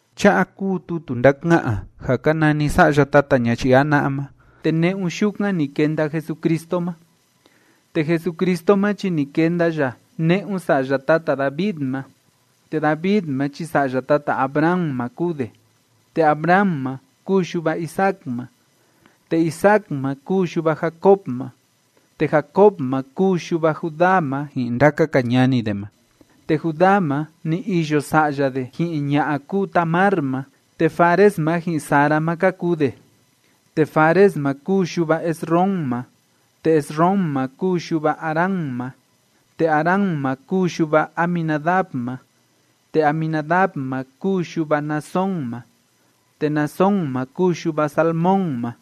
Cha'a kúu tutu ndáka'an ja ka nani sa'ya tata ñayii jana'a ma, te ne'un yukan ni kenda Jesucristo ma. Te Jesucristo ma chi ni kenda ya ne'un sa'ya tata David ma, te David ma chi sa'ya tata Abraham ma kúu de. Te Abraham ma kúu yuva Isaac ma, te Isaac ma kúu yuva Jacob ma, te Jacob ma kúu yuva Judá ma ji'in ndaka‑ka ñani de ma. Te Judá ma, ni iyo sa'ya de ji'in ña'a kúu Tamar ma, te Fares ma ji'in Zara ma ka kuu de. Te Fares ma kúu yuva Esrom ma, te Esrom ma kúu yuva Aram ma. Te Aram ma kúu yuva Aminadab ma, te Aminadab ma kúu yuva Naasón ma, te Naasón ma kúu yuva Salmón ma.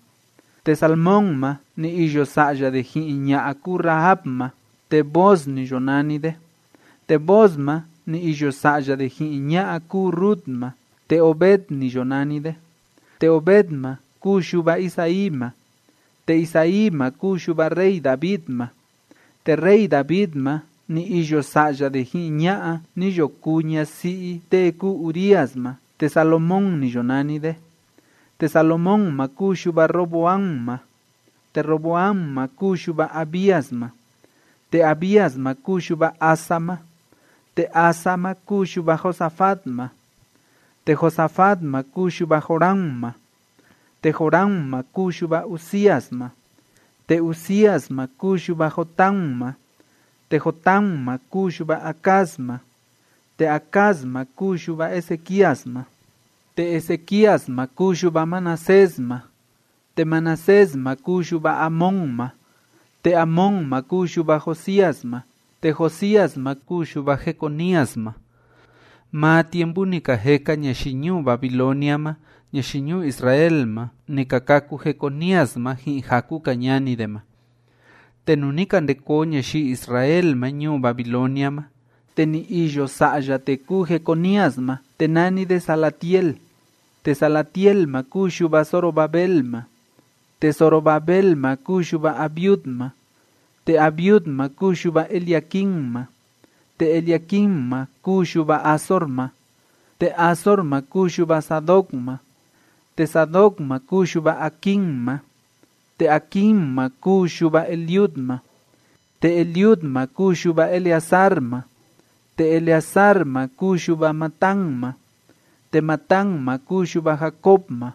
Te Salmón ma, ni iyo sa'ya de ji'in ña'a kúu Rahab ma, te Booz ni yo nani de. Te Booz ma, ni iyo sa'ya de ji'in ña'a kúu Rut ma, te Obed ni yo nani de. Te Obed ma kúu yuva Isaí ma. Te Isaí ma kúu yuva rey David ma. Te rey David ma, ni iyo sa'ya de ji'in ña'a ni yo kuu ñasi'i tee kúu Urías ma, te Salomón ni yo nani de. Te Salomón ma kúu yuva Roboam ma, te Roboam ma kúu yuva Abías ma, te Abías ma kúu yuva Asa ma. Te Asa ma kúu yuva Josafat ma, te Josafat ma kúu yuva Joram ma, te Joram ma kúu yuva Uzías ma. Te Uzías ma kúu yuva Jotam ma, te Jotam ma kúu yuva Acaz ma, te Acaz ma kúu yuva Ezequías ma. Te Ezequías ma kúu yuva Manasés ma, te Manasés ma kúu yuva Amón ma, te Amón ma kúu yuva Josías ma. Te Josías ma kúu yuva Jeconías ma; maa tiempu ni ka jeka ñayii ñuu Babilonia ma ñayii ñuu Israel ma, ni ka kâku Jeconías ma ji'in jaku‑ka ñani de ma. Te nuu ni ka nde koo ñayii Israel ma ñuu Babilonia ma, te ni iyo sa'ya tee kúu Jeconías ma, te nani de Salatiel, te Salatiel ma kúu yuva Zorobabel ma. Te Zorobabel ma kúu yuva Abiud ma, te Abiud ma kúu yuva Eliaquim ma, te Eliaquim ma kúu yuva Azor ma. Te Azor ma kúu yuva Sadoc ma, te Sadoc ma kúu yuva Aquim ma, te Aquim ma kúu yuva Eliud ma. Te Eliud ma kúu yuva Eleazar ma, te Eleazar ma kúu yuva Matán ma, te Matán ma kúu yuva Jacob ma.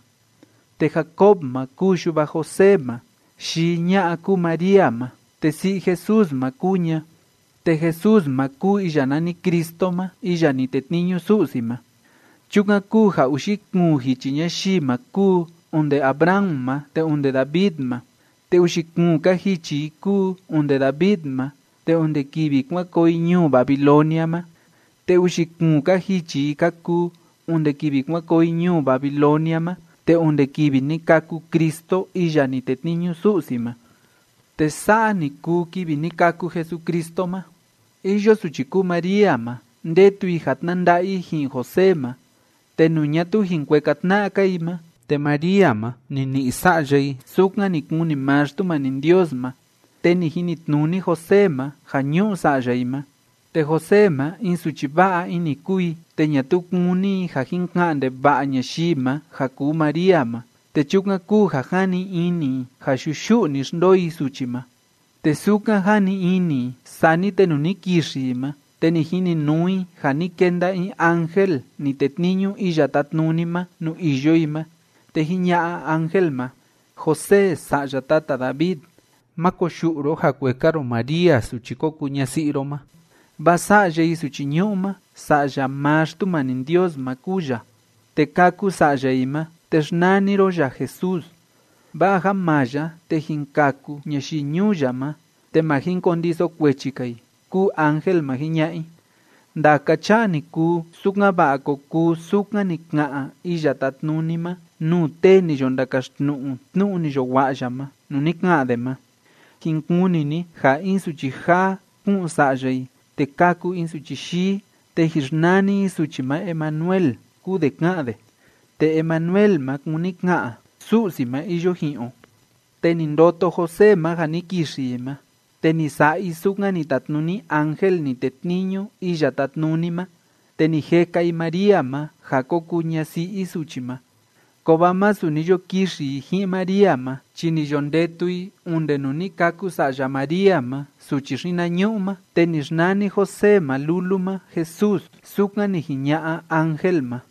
Te Jacob ma kúu yuva José ma, yii ña'a kúu María ma, te si'i Jesús ma kúu ña, te Jesús ma kúu iya nani Cristo ma iya ni tetniñu Su'si ma. Chukan kúu ja uxi kuun jichi ñayii ma kúu onde Abraham ma te onde David ma, te uxi kuun‑ka jichi i kúu onde David ma te onde kivi kuan koo i ñuu Babilonia ma, te uxi kuun‑ka jichi i ka kuu onde kivi kuan koo i ñuu Babilonia ma te onde kivi ni kâku Cristo iya ni tetniñu Su'si ma. Te sa'a ni kuu kivi ni kâku Jesucristo ma. Iyo suchi kúu María ma, ndetu i ja tnanda'a i ji'in José ma, te nuu ñatuu jin kueka tna'a‑ka i ma, te María ma, ni ni'i sa'ya i sukan ni kuni maa Xtumani Ndios ma. Te ni jinitnuni José ma ja ñu'u sa'ya i ma. Te José ma, in suchi va'a ini kúu i, te ñatuu kúni i ja jin ka'an ndeva'a ñayii ma ja kuu María ma, te chukan kúu ja jani ini i ja yuyu'u‑ni xndoo i suchi ma. Te sukan jani ini i. Sani te nuu ni kixi i ma, te ni jininuu i ja ni kenda in ángel ni tetniñu Iya Tátnuni ma nuu iyo i ma, te jiña'a ángel ma: ―José sa'ya tata David, má koyu'u ro ja kueka ro María suchi ko kuu ñasi'i ro ma, vaa sa'ya i suchi ñu'u ma, Sa'ya maa Xtumani Ndios ma kúu ya. Te kâku sa'ya i ma, te xnani ro ya Jesús, vaa ja maa ya te jin kaku ñayii ñuu ya ma te ma jin kondiso kuechi‑ka i ―kúu ángel ma jiña'a i. Ndaka cha'a ni kuu, sukan‑va'a ko kuu sukan ni ka'an Iya Tátnuni ma nuu tee ni yo ndakaxtnu'u tnu'u ni yo wa'a ya ma, nuu ni ka'an de ma: Jin kuni ni ja in suchi jaa, ku'un sa'ya i, te kâku in suchi yii, te jin xnani i suchi ma Emanuel, kúu de ká'an de. Te Emanuel ma kúni ka'an “Su'si ma iyo ji'in o”. Te ni ndoto José ma ja ni kixi i ma, te ni sa'a i sukan ni tatnuni ángel ni tetniñu Iya Tátnuni ma, te ni jeka i María ma ja ko kuu ñasi'i i suchi ma. Kovaa masu ni yo kixi i ji'in María ma, chi ni yo ndetu i onde nuu ni kâku sa'ya María ma suchi xinañu'u ma, te ni xnani José ma lulu ma Jesús, sukan ni jiña'a ángel ma.